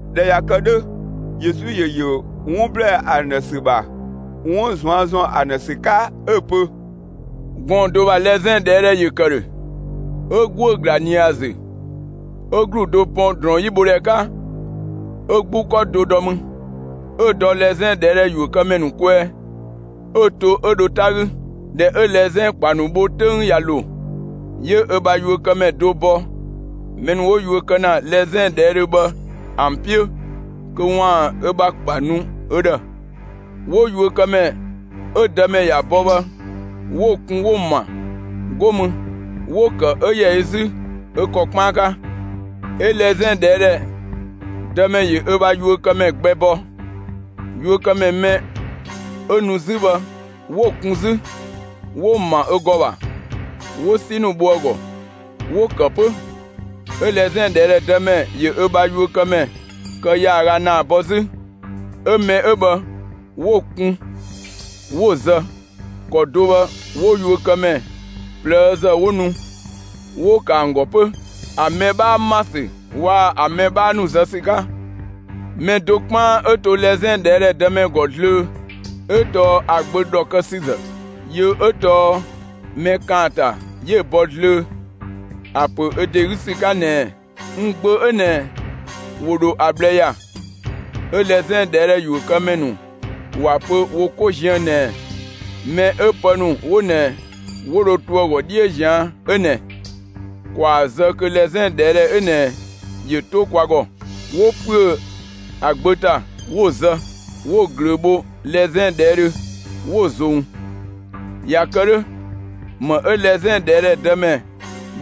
꞊Dhɛ ꞊ya kë 'dhö, Yesu ‑yö ‑yö 'wun ‑blɛɛ ‑an ‑dhë ‑sü ‑bha, 'wun ꞊zuan' ‑zɔn ‑an ‑dhë ‑sü 'ka 'ö‑ pö: «Gɔɔn‑ do ‑bha lɛzɛn ꞊dhɛɛdhɛ ‑yö ‑kë ‑dhö. 'Ö ‑guö ‑gla ꞊nië ‑a ‑zü, 'ö ‑glu do pɔn ‑drɔɔn 'yi bho ‑dhɛ 'ka, 'ö 'gbu 'kɔ do dɔ mü, 'ö‑ dɔ lɛzɛn ꞊dhɛɛdhɛ ‑yuökëmɛ ‑nu kwɛɛ, 'ö‑ to 'ö dho 'ta 'gü. ꞊Dhɛ 'ö lɛzɛn ‑kpa ‑nu bho 'töng ꞊ya ‑lo, 'yö ö bha yuökëmɛ do bɔ mɛ ‑nu 'wo yuö kë ‑na lɛzɛn ꞊dhɛɛdhö bhë ‑an 'piö, kö ‑waan ö ‑bha ‑kpa nu ö ‑dhë. 'Wo yuökëmɛ 'ö‑ dëmɛ ‑ya bɔ bhë 'wo‑ kun 'wo‑ ‑ma; 'go mü 'wo‑ ‑kë 'ö ‑yɛ ö 'zü ö ‑kɔ 'kpaan 'ka. 'Ö lɛzɛn ꞊dhɛɛdhɛ dëmɛ ‑yö ö bha yuökëmɛ gbɛ bɔ. Yuökëmɛ mɛ 'ö nu 'zü bhë 'wo‑ kun 'zü, 'wo‑ ‑ma ö ‑gɔ ‑bha, 'wo 'si ‑nu bho ‑a ‑gɔ, 'wo‑ ‑kë 'pö. 'Ö lɛzɛn ꞊dhɛɛdhɛ dëmɛ ‑yö ö bha yuökëmɛ kë ‑yaaga ‑naa bɔ 'zü. 'Ö mɛ 'ö bhë 'wo‑ kun 'wo‑ zë. ‑Kɔ do bhë 'wo yuökëmɛ ꞊plëëzë 'wo nu, 'wo‑ ‑kë ‑an ‑gɔ 'pö, ‑an mɛ 'bhaa ‑ma ‑sü waa‑ ‑an mɛ 'bhaa ‑nu zë ‑sü 'ka. Mɛ do 'kpaan 'ö to lɛzɛn ꞊dhɛɛdhɛ dëmɛ ‑gɔ zlöö, 'ö tɔɔ ‑a gbö ‑dhɔkësüzë. Yö 'ö tɔɔ mɛ ‑kaanta 'yö‑ bɔ zlöö, ‑a ‑pö ö ‑de 'gü ‑sü 'ka ꞊nɛɛ: ‹N gbö 'ö ꞊nɛ, ‑wo ‑dho ‑a ꞊bhlë ‑ya.› 'Ö lɛzɛn ꞊dhɛɛdhɛ ‑yuökëmɛ ‑nu ‑wa pö wo 'ko ziën ꞊nɛɛ: ‹Mɛ 'ö pë ‑nu 'wo ꞊nɛ 'wo dho to ‑a ‑gɔ 'dhiö ꞊zian' 'ö ꞊nɛ, ‑kwaa zë kö lɛzɛn ꞊dhɛɛdhɛ 'ö ꞊nɛ ‑yö 'to kwa ‑gɔ!› 'Wo ‑püö ‑a gbö ‑ta, 'wo‑ zë, 'wo‑ ꞊glöö bho lɛzɛn ꞊dhɛɛdhö, 'wo‑ ‑zong. ꞊Ya kë 'dhö, ‑më 'ö lɛzɛn ꞊dhɛɛdhɛ dëmɛ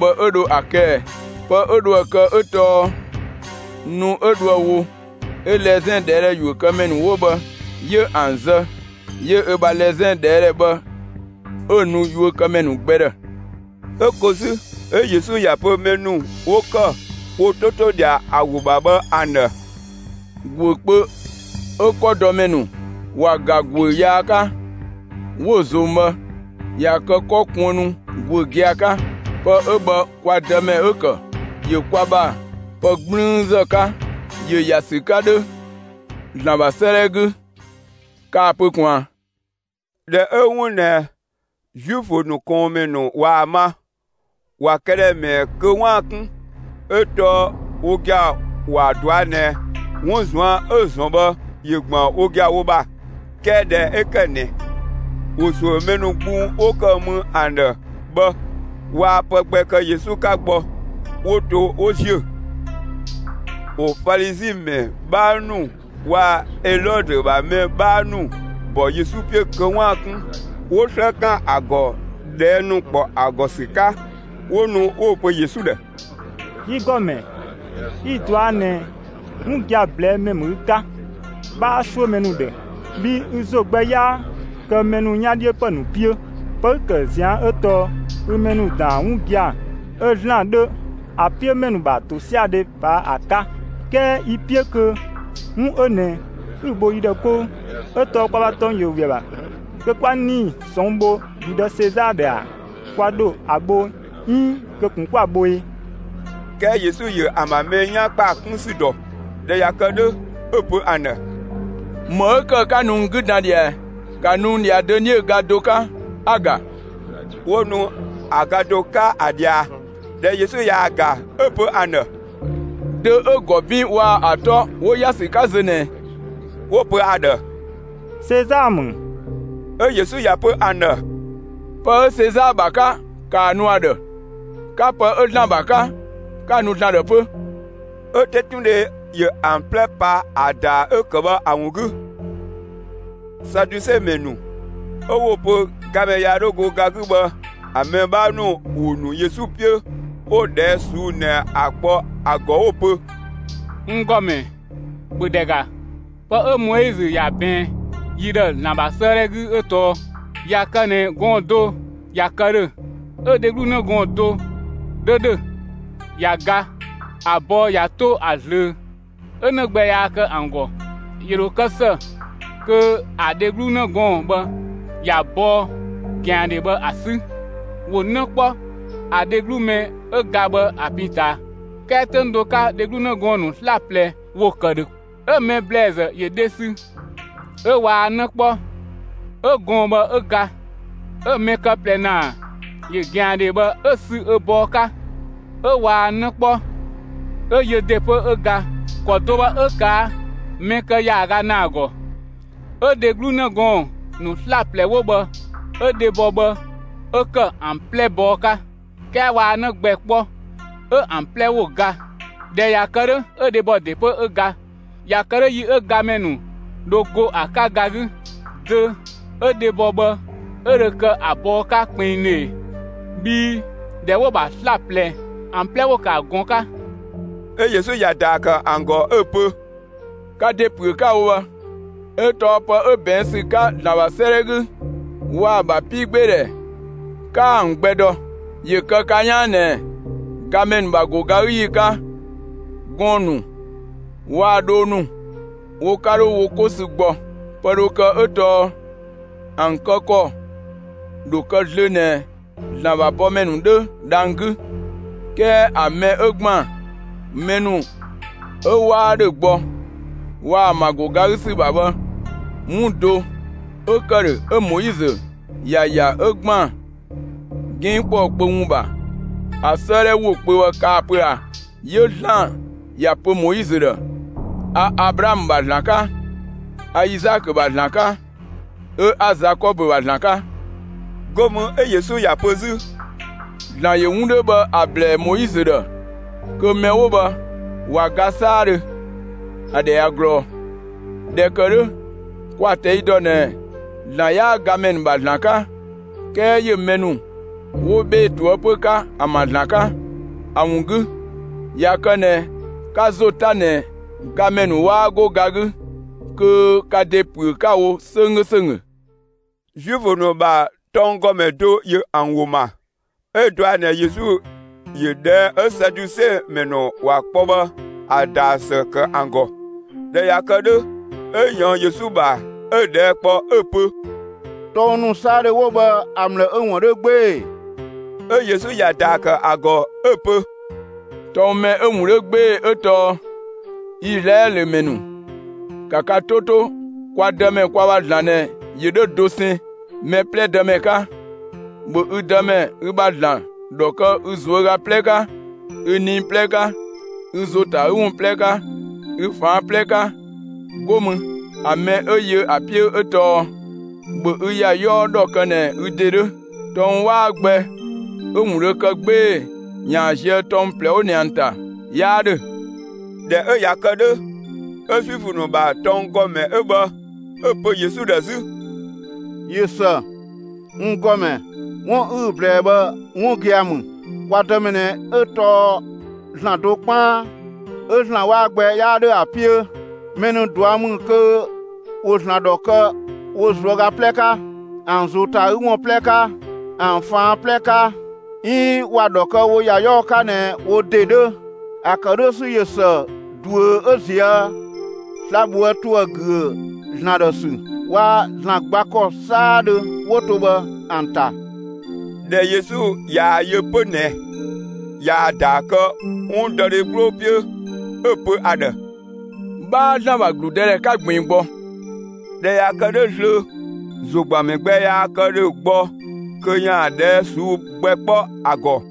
bhë 'ö dho ‑a kë ꞊ɛ? Pë 'ö dho ‑a kë 'ö tɔɔ nu 'ö dhoë‑ wo, 'ö lɛzɛn ꞊dhɛɛdhɛ ‑yuökëmɛ ‑nu 'wo bhë 'yö ‑an zë, 'yö ö bha lɛzɛn ꞊dhɛɛdhɛ bhë 'ö‑ nu yuökëmɛ ‑nu gbɛ ‑dhë.» 'Ö ko 'zü, 'ö Yesu ‑ya pö mɛ ‑nu 'wo ‑kë wo 'to 'to ꞊dhia ‑a ‑wo ‑bha bhë ‑an ‑dhë: «‑Guö kpö 'ö 'kɔdɔmɛ ‑nu ‑wa ‑ga ‑guö yaa 'ka, 'wo‑ ꞊zong bhë, ꞊ya kë 'kɔ kuënnu ‑guö gia‑ 'ka. Pë 'ö bhë kwa Dëmɛ 'ö‑ ‑kë, ‑yö kwa ‑bha pë 'gblüünzë 'ka. ‑Yö ‑ya ‑sü 'ka 'dhö ‑Zlan ‑bha 'sëëdhɛ 'gü. Kaa‑ pö ꞊kun ꞊a?» ꞊Dhɛ 'ö 'wun ꞊nɛ Zuifö ‑nu ꞊kɔɔnmɛ ‑nu ꞊waa‑ ma, ‑wa këdhɛ ‑mɛɛ kö 'waan‑ 'kun, 'ö tɔɔ wo gia‑ ‑wa ꞊dɔa' ꞊nɛ 'wun ꞊zuan' 'ö‑ ‑zɔn bhë, ‑yö ‑gban wo gia‑ wo ‑bha. 'Kɛɛ ꞊dhɛ 'ö ‑kë ꞊nɛ, ‑wo ‑suö mɛ ‑nu gbung 'wo ‑kë mü ‑an ‑dhë bhë, waa pë gbɛ kë Yesu 'ka gbɔ, 'wo‑ to 'wo ‑ziö. ‑Wo Falizi ‑mɛ 'bhaa ‑nu waa‑ Elɔdö ‑bha mɛ 'bhaa ‑nu ‑bɔ Yesu 'piö kö 'waan‑ 'kun, 'wo 'slë ‑kan ‑a ‑gɔ ꞊dhɛɛ' ‑nu ‑kpɔ ‑a ‑gɔ ‑sü 'ka. 'Wo nu 'wo‑ pö Yesu ‑dhë: «Yi ‑Gɔmɛ, 'yi‑ ꞊dɔa' ꞊nɛ 'wun gia‑ ꞊blɛɛ'‑ ‑mɛ ‑mü ü 'ka, 'bhaa 'suö mɛ ‑nu ‑dhë, bhii ü ‑zo gbɛ 'yaa kë mɛ ‑nu 'yan 'dhiö ‑pë ‑nu 'piö; pë 'ü‑ ‑kë ꞊zian' 'ö tɔɔ ü mɛ ‑nu ‑daan 'wun gia‑ 'ö ‑Zlan 'dhö ‑a 'piö mɛ ‑nu ‑bha ‑tosiadhe ꞊paa' ‑a 'ka. 'Kɛɛ yi‑ 'piö kö 'wun 'ö ꞊nɛ 'ü‑ bho yi ‑dhë 'kou. 'Ö tɔɔ kwa ‑bha tɔng ‑yö ‑we ‑a ‑bha kö 'kwa 'nii‑ ꞊sɔnng' bho ‑gludë Sezaa ‑dhë ‑a? Kwa ‑dho ‑a bho, 'iin kö ꞊kun 'kwa‑ bho e?» 'Kɛɛ Yesu ‑yö ‑an ‑bha mɛ 'yan ‑kpaa 'kun ‑sü ‑dɔ. ꞊Dhɛ ꞊ya kë 'dhö, 'ö‑ pö ‑an ‑dhë: «‑Më 'ö ‑kë 'ka nu n 'gü dan ꞊dhia ꞊ɛ? ‑Ka nu n ꞊dhia dönie ga do 'ka, 'a‑ ‑ga!» 'Wo nu ‑a ga do 'ka ‑a ꞊dhia. ꞊Dhɛ Yesu ꞊yaa‑ ‑ga, 'ö‑ pö ‑an ‑dhë: «Dö 'ö‑ ‑gɔ 'bin waa‑ ‑a 'tɔ 'wo ‑ya ‑sü 'ka zö ꞊nɛ ꞊ɛ?» 'Wo‑ pö ‑a ‑dhë: «Sezaa ‑mü.» 'Ö Yesu ‑ya pö ‑an ‑dhë: «Pë 'ö Sezaa ‑bha 'ka, ‑kaa nu ‑a ‑dhë; 'ka pë 'ö ‑Zlan ‑bha 'ka, 'ka‑ nu ‑Zlan ‑dhë 'pö!» 'Ö 'tetundhe ‑yö ‑an 'plɛ pa ‑a ‑daa 'ö‑ ‑kë bhë ‑a ‑wun 'gü. Saduse mɛ ‑nu 'ö 'wo‑ pö gamɛ yaa 'dhö go ga 'gü bhë ‑a mɛ 'bhaa ‑nu ‑wo ‑nu Yesu 'piö, 'wo ꞊dhɛɛ' ꞊suu'‑ ꞊nɛ ‑a kpɔ ‑a ‑gɔ 'wo‑ pö: «N ‑Gɔmɛ, ‑bhö ‑dhɛ ‑ga, pë 'ö Moizö ‑ya ꞊bɛɛn yi ‑dhë ‑Zlan ‑bha 'sëëdhɛ 'gü 'ö tɔɔ: ꞊Ya kë ꞊nɛ gɔɔn‑ do ꞊ya kë ‑dhö, 'ö‑ dheglu 'në gɔɔn‑ do 'dhö ‑dhö. ꞊Ya ga, ‑a bɔɔ ꞊ya 'to ‑a ꞊zlöö, 'ö 'në gbɛ yaa kë ‑an ‑gɔ, ‑yö ‑dho kë ‑së kö ‑a dheglu 'në gɔɔn‑ bhë ‑ya bɔɔ ꞊gɛandhe bhë ‑a 'sü, ‑wo 'në kpɔ ‑a dheglu mɛ 'ö ga bhë ‑a pin ꞊taa. 'Kɛɛ 'töng do 'ka, dheglu 'në gɔɔn‑ ‑nu 'slaplɛ ‑wo ‑kë ‑dhö. 'Ö‑ mɛ ‑blɛɛzë ‑yö dhe sü, 'ö waa 'në 'kpɔ, 'ö gɔɔn‑ bhë 'ö ga. 'Ö‑ mɛ kë ꞊plɛ ‑naa ‑yö ꞊gɛandhe bhë 'ö‑ sü ö bɔɔ 'ka, 'ö waa 'në 'kpɔ, 'ö yö ‑de 'pö 'ö ga. ‑Kɔ do bhë 'ö ꞊kaa' mɛ ‑kë ‑yaaga ‑naa ‑gɔ. 'Ö dheglu 'në gɔɔn‑ ‑nu 'slaplɛ 'wo bhë 'ö dhebɔ bhë 'ö ‑kë ‑an 'plɛ bɔɔ 'ka, 'kɛɛ waa 'në gbɛ 'kpɔ, 'ö ‑an 'plɛ ‑wo ga. ꞊Dhɛ ꞊ya kë 'dhö, 'ö dhebɔ ‑de 'pö 'ö ga. ꞊Ya kë 'dhö, yi 'ö gamɛ ‑nu ‑dho go ‑a 'ka ga 'gü, dö 'ö dhebɔ bhë 'ö dhö kë ‑a bɔɔ 'ka kpinngdhö ꞊e? Bhii ꞊dhɛ 'wo‑ ‑bha 'slaplɛ ‑an 'plɛ ‑wo ‑kë ‑a ꞊gɔn 'ka!» 'Ö Yesu ‑ya ‑daa ‑kë ‑an ‑gɔ 'ö‑ pö: «Ka ‑de ‑püö 'ka‑ wo bhë, 'ö tɔɔ pë 'ö ꞊bɛɛn' ‑sü 'ka ‑Zlan ‑bha 'sëëdhɛ 'gü waa‑ ‑a ‑bha 'piigbeedhɛ 'kaa ‑an gbɛ dɔ. ‑Yö kë ka 'yaan ꞊nɛɛ: Gamɛ ‑nu ‑bha ‑go ga 'gü ‑yi 'ka, gɔɔn‑ ‑nu waa‑ dhoo ‑nu wo 'ka 'dho wo 'ko sü gbɔ. Pë dhö kë 'ö tɔɔ ‑an kë ‑kɔ ‑dho kë zlöö ꞊nɛ ‑Zlan ‑bha bɔmɛ ‑nu 'dhö dhang‑ 'gü. 'Kɛɛ ‑a mɛ 'ö ‑gban mɛ ‑nu 'ö 'waa ‑dhö gbɔ, waa‑ ‑an ‑bha ‑go ga 'gü ‑sü ‑bha bhë; 'wun do 'ö ‑kë ‑dhö, 'ö Moizö ‑ya ‑ya 'ö ‑gban 'ginng ‑kpɔɔ kpö ‑wun ‑bha, ‑a 'sëëdhɛ ‑wo kpö bhë kaa‑ pö ꞊a? 'Yö ‑Zlan ‑ya pö Moizö ‑dhë: A Ablaamö ‑bha ‑Zlan 'ka, 'a Izaakö ‑bha ‑Zlan 'ka, 'ö 'a Zakɔbö ‑bha ‑Zlan 'ka.» 'Go mü 'ö Yesu ‑ya pö 'zü: «‑Zlan ‑yö 'wun 'dhö bhë ‑a ‑blɛɛ Moizö ‑dhë kö mɛ 'wo bhë ꞊wa ga 'saadhö, ‑a ‑dhɛ ꞊ya ꞊glɔɔ. ꞊Dhɛ ‑kë 'dhö, kwa‑ ꞊tɛi' ‑dɔ ꞊nɛ ‑Zlan 'yaa gamɛ ‑nu ‑bha ‑Zlan 'ka, 'kɛɛ ‑yö mɛ ‑nu 'wo 'bhee‑ ꞊toëpö 'ka, ‑an ‑bha ‑Zlan 'ka. ‑A ‑wun 'gü, ꞊ya kë ꞊nɛ 'ka ‑zo 'ta ꞊nɛ gamɛ ‑nu 'waa 'go ga 'gü, kö ka ‑de ‑püö 'ka‑ wo 'sönggö ‑sönggö!» Zuifö ‑nu ‑bha tɔnggɔmɛ do ‑yö ‑an ‑wo ‑ma, 'ö dɔa ꞊nɛ Yesu ‑yö ꞊dhɛɛ' 'ö Saduse ‑mɛ ‑nu ‑wa kpɔ bhë ‑a ‑daa ‑së ‑kë ‑an ‑gɔ. ꞊Dhɛ ꞊ya kë 'dhö, 'ö ꞊yɔɔn Yesu ‑bha, 'ö‑ ꞊dhɛɛ' kpɔ 'ö‑ pö: «Tɔng ‑nu 'saadhö 'wo bhë ‑a ‑mlë 'ö‑ ‑wun 'dhö 'gbee‑ ‑e?» 'Ö Yesu ‑ya ‑daa ‑kë ‑a ‑gɔ, 'ö‑ pö: «Tɔng mɛ 'ö‑ ‑wun 'dhö 'gbee‑ 'ö tɔɔ: Izlaɛlö ‑mɛ ‑nu, ‑ka ka 'to 'to, kwa Dëmɛ, kwa ‑bha ‑Zlan ꞊nɛ, ‑yö 'dhö dosɛn, mɛ 'plɛ Dëmɛ 'ka. ‑Bhö ü Dëmɛ, ü bha ‑Zlan, ‑dhɔ kë ü ꞊zuöga 'plɛ 'ka, ü nii 'plɛ 'ka, ü ‑zo ‑ta ‑a 'gü ‑wun 'plɛ 'ka, ü ꞊faan' 'plɛ 'ka! 'Go mü, ‑a mɛ 'ö yö ‑a 'piö 'ö tɔɔ: ‑Bhö ü ‑ya 'yɔɔ ‑dhɔ kë ꞊nɛ ü ‑de 'dhö! Tɔng 'waa gbɛ 'ö‑ 'wun dho kë 'gbee‑ ‑yaan zië tɔng ꞊plɛ 'wo ꞊nɛ ‑an ‑ta 'yaa ‑dhö.» ꞊Dhɛ 'ö ꞊ya kë 'dhö, 'ö Zuifö ‑nu ‑bha tɔnggɔmɛ 'ö bhë, 'ö‑ pö Yesu ‑dhë 'zü: «꞊Yö ‑së, n ‑Gɔmɛ, 'wun 'ü‑ ꞊blɛɛ bhë 'wun gia‑ ‑mü, kwa Dëmɛ ꞊nɛ 'ö tɔɔ ‑Zlan do 'kpaan, 'ö ‑Zlan 'waa gbɛ 'yaa ‑dhö ‑a 'piö. Mɛ ‑nu ꞊dua' ‑mü kö ‑wo ‑Zlan ‑dhɔ kë wo ꞊zuöga 'plɛ 'ka, ‑an ‑zo ‑ta ‑a 'gü ‑wun 'plɛ 'ka, ‑an ꞊faan' 'plɛ 'ka; 'iin ‑wa ‑dhɔ kë wo ‑ya 'yɔɔ 'ka ꞊nɛ wo ‑de 'dhö. ‑A ‑kë 'dhö ‑sü ꞊yö ‑së ꞊duö 'ö ꞊zië' sla‑ ꞊bhoë' ‑tuë ‑güö ‑Zlan ‑dhë ‑sü waa‑ ‑Zlan gba ‑kɔ 'saadhö 'wo to bhë ‑an ‑ta.» ꞊Dhɛ Yesu ꞊yaa‑ yö 'pö ꞊nɛ ꞊yaa‑ ‑daa kë 'wundɔdhe 'gbloo 'piö, 'ö‑ pö ‑a ‑dhë: «'Bhaa ‑Zlan ‑bha ‑gludëdhɛ 'ka ꞊gbiin gbɔ.» ꞊Dhɛ ꞊ya kë 'dhö zlöö, ‑zogbanmɛ gbɛ yaa kë ‑dhö gbɔ kö ‑yaan ꞊dhɛɛ' ꞊suu'‑ gbɛ kpɔ ‑a ‑gɔ.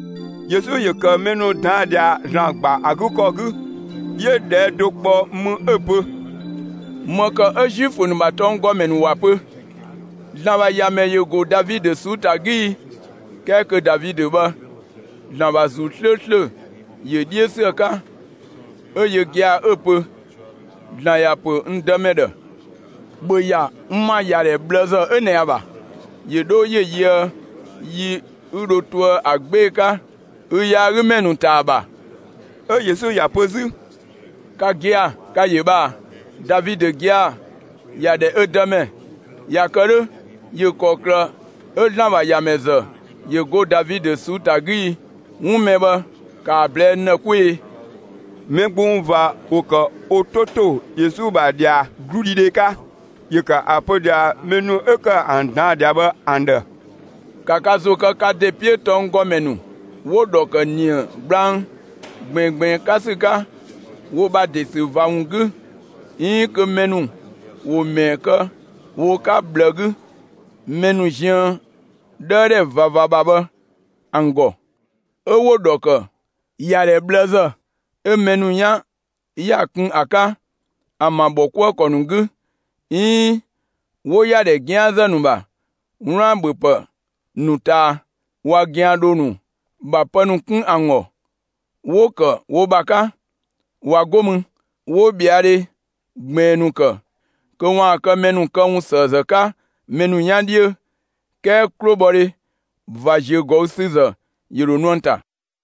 Yesu ‑yö ‑kë mɛ ‑nu ꞊daan' ꞊dhia, ‑Zlan ‑gba ‑a 'gü ‑kɔ 'gü, 'yö ꞊dhɛɛ' do ‑kpɔ mü 'ö‑ pö: «‑Më ‑kë 'ö Zuifö ‑nu ‑bha tɔnggɔmɛ ‑nu ‑wa pö: ‹‑Zlan ‑bha ‑Yamɛ ‑yö ‑go Davidö ꞊suu'‑ ‑ta 'gü› ii? 'Kɛɛ kö Davidö bhë, ‑Zlan ‑bha ‑Zuu 'slööslö ‑yö 'dhiö ‑sü ‑a 'ka, 'ö yö gia‑ 'ö‑ pö: ‑Zlan ‑ya pö n Dëmɛ ‑dhë: ‑Bhö ‑ya n ‑ma ‑yadhɛ ꞊bhlëzë 'ö ꞊nɛ ‑a ‑bha, ‑yö 'dho ‑yö yöë yi 'ü dho toë ‑a 'gbee‑ 'ka ü yaagümɛ ‑nu ‑ta ‑a ‑bha!» 'Ö Yesu ‑ya pö 'zü: «Ka gia‑, ka‑ ‑yö bhë ꞊a? Davidö gia‑ ‑ya ‑dhɛ ö Dëmɛ; ꞊ya kë 'dhö, ‑yö ‑kɔklë 'ö ‑Zlan ‑bha ‑Yamɛ ‑zë ‑yö go Davidö ꞊suu'‑ ‑ta 'gü i? 'Wun mɛ bhë ‑ka ‑a ꞊blɛɛ'‑ n ‑dhë 'kwee‑!» Mɛ gbung ꞊va ‑wo ‑kë wo 'to ‑to Yesu ‑bha ꞊dhia 'gludhidhe 'ka. ‑Yö ‑kë ‑a pö ꞊dhia mɛ ‑nu 'ö ‑kë ‑an ꞊daan' ꞊dhia bhë ‑an ‑dhë: «‑Ka ka ‑zo kë ka ‑de 'piö tɔnggɔmɛ ‑nu 'wo‑ ‑dhɔ ‑kë ‑nië gblang ꞊gbiingbiin 'ka ‑sü 'ka wo ‑bha ‑de ‑sü ꞊va ‑wun 'gü, 'iin kö mɛ ‑nu ‑wo ‑mɛɛ kë wo 'ka ꞊bhlë 'gü, mɛ ‑nu ziën 'dhëëdhɛ ꞊vava ‑bha bhë ‑an ‑gɔ. 'Ö 'wo‑ ‑dhɔ ‑kë ‑yadhɛ ꞊bhlëzë 'ö mɛ ‑nu 'yan ‑ya kun ‑a 'ka, ‑an ‑bha ‑bhɔkuëkɔ ‑nu 'gü, 'iin 'wo ‑yadhɛ 'gianzë ‑nu ‑bha 'wlaan‑ ‑bhöpë ‑nu ꞊taa. ꞊Wa ꞊gɛandhoo ‑nu ‑bha pë ‑nu 'kun ‑an ‑gɔ, 'wo‑ ‑kë wo ‑bha 'ka. ꞊Wa 'go mü, 'wo ꞊bhɛadhe ꞊gbiin ‑nu ‑kë, kö ‑waan kë mɛ ‑nu këwunsëëzë 'ka mɛ ‑nu 'yan 'dhiö. 'Kɛɛ 'klobhɔdhe ꞊va ‑ziögɔüsüzë ‑yö ‑dho nu ‑an ‑ta.»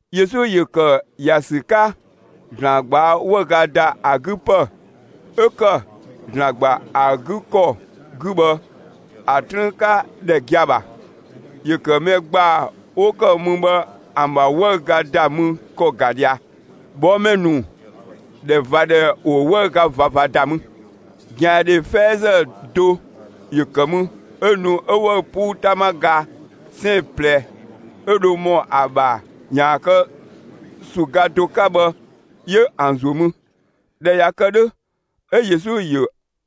Yesu ‑yö ‑kë ‑ya ‑sü 'ka ‑Zlan ꞊gbaa' 'wëüga ‑da ‑a 'gü ‑pë 'ö ‑kë ‑Zlan ‑gba ‑a 'gü ‑kɔ 'gü bhë, ‑a 'trüün 'ka ‑dhɛ gia‑ ‑bha. ‑Yö ‑kë mɛ ‑gbaa 'wo ‑kë mü bhë ‑an ‑bha 'wëüga ‑da mü ‑kɔ ‑ga ꞊dhia. ꞊Bhɔɔmɛ ‑nu ‑dhɛ ꞊va ‑dhɛ ‑wo 'wëüga ꞊vava ‑da mü. ꞊Gɛandhe 'fɛɛzë do ‑yö ‑kë mü, 'ö nu 'ö 'wëü‑ 'puu 'tama ga 'sɛɛn‑ ꞊plɛ, 'ö dho ‑mɔ ‑a ‑bha ‑yaan kë ‑su ga do 'ka bhë 'yö ‑an ‑zuö mü. ꞊Dhɛ ꞊ya kë 'dhö, 'ö Yesu ‑yö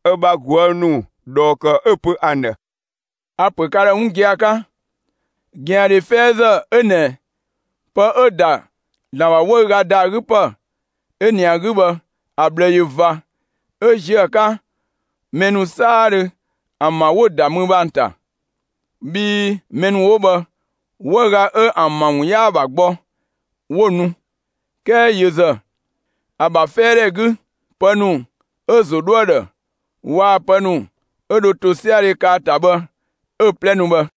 ö bha ꞊guë' ‑nu ꞊dhɔɔ ‑kë, 'ö‑ pö ‑an ‑dhë: «A‑ ‑pö ka ‑dhë 'wun gia‑ 'ka: ꞊Gɛandhe 'fɛɛzë 'ö ꞊nɛ pë 'ö‑ ‑da ‑Zlan ‑bha 'wëüga ‑da ‑a 'gü ‑pë 'ö ꞊nɛ ‑a 'gü bhë, ‑a ꞊bhlë ꞊yö ꞊va, 'ö ꞊zië' ‑a 'ka mɛ ‑nu 'saadhö ‑an ‑bha 'wo‑ ‑da mü bhë ‑an ‑ta. Bhii mɛ ‑nu 'wo bhë, 'wëüga 'ö ‑an ‑bha ‑wun 'yaa‑ ‑bha gbɔ, 'wo‑ nu, 'kɛɛ yö ‑zë, ‑a ‑bha 'fɛɛdhɛ 'gü ‑pë ‑nu 'ö‑ ‑zo 'dhoë‑ ‑dhë waa‑ pë ‑nu 'ö dho ‑tosiadhe kë ‑a ‑ta bhë 'ö‑ 'plɛ nu bhë.»